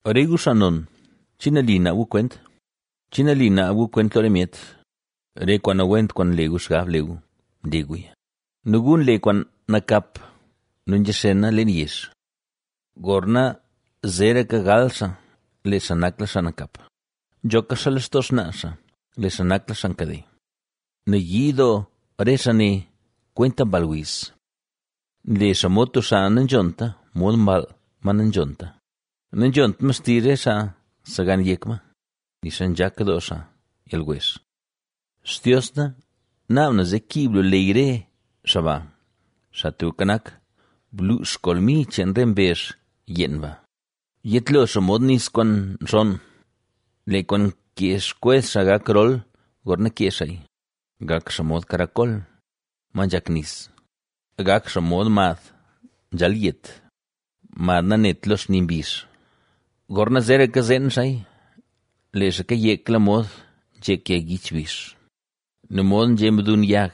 Re gu, xaa non, ¿che nali naab gu kwent? ¿Che nali naab gu kwent lo re myet? Re kwaan nawent kwaan nle gu xgab le gu, nle guya nu gu nle kwaan nakap nu nzhaxena leen yezh. Gorna zeeraka gal xaa lee xaa nakla xaa nakap; nzhoka xaa lextoo xnaa xaa, lee xaa nakla xaa nkade. Nayii doo re xaa ne kwenta mball wiz; nle xaa mod tub xaa nanzhonta, mod mball ma nanzhonta, nanzhont ma xtizh re xaa nsegan yek ma, nixa nzhak doo xaa yalwezh. Xtios na, ¡naab na zee kiib lu ley re xaa ba! Xaa Tubka Nak, ¡bluux kolmi cheen re mbezh yeen ba! Yetlo xaa mod nis kwaan nxonn; ¡lee kwaan nkee xkwez xaa gak rol gorna kee xaaya! ¡Gak xaa mod karakol, ma nzhak nis! ¡Gak xaa mod mad nzhalyet, mad nanet lo xni mbizh! ¡Gorna zeraka zeen xaaya, lee xaa kayekla modxa nzhek yag yich bizh! ¡Nu mod nzhe mdun yag,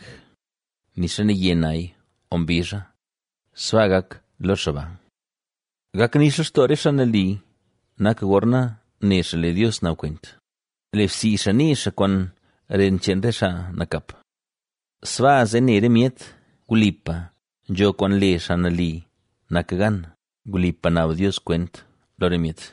nixa naye naya o mbizha, sbaa gak lo xaa ba! Gak nix lextoo re xaa nali nak gorna ne xaa lee Dios naab kwent; lebsii xaa nii xaa kwaan ren cheen re xaa nakap. Sbaa zee ne re myet: Wlipa nzho kwaan le xaa nali nak gan; wlipa naab Dios kwent lo re myet.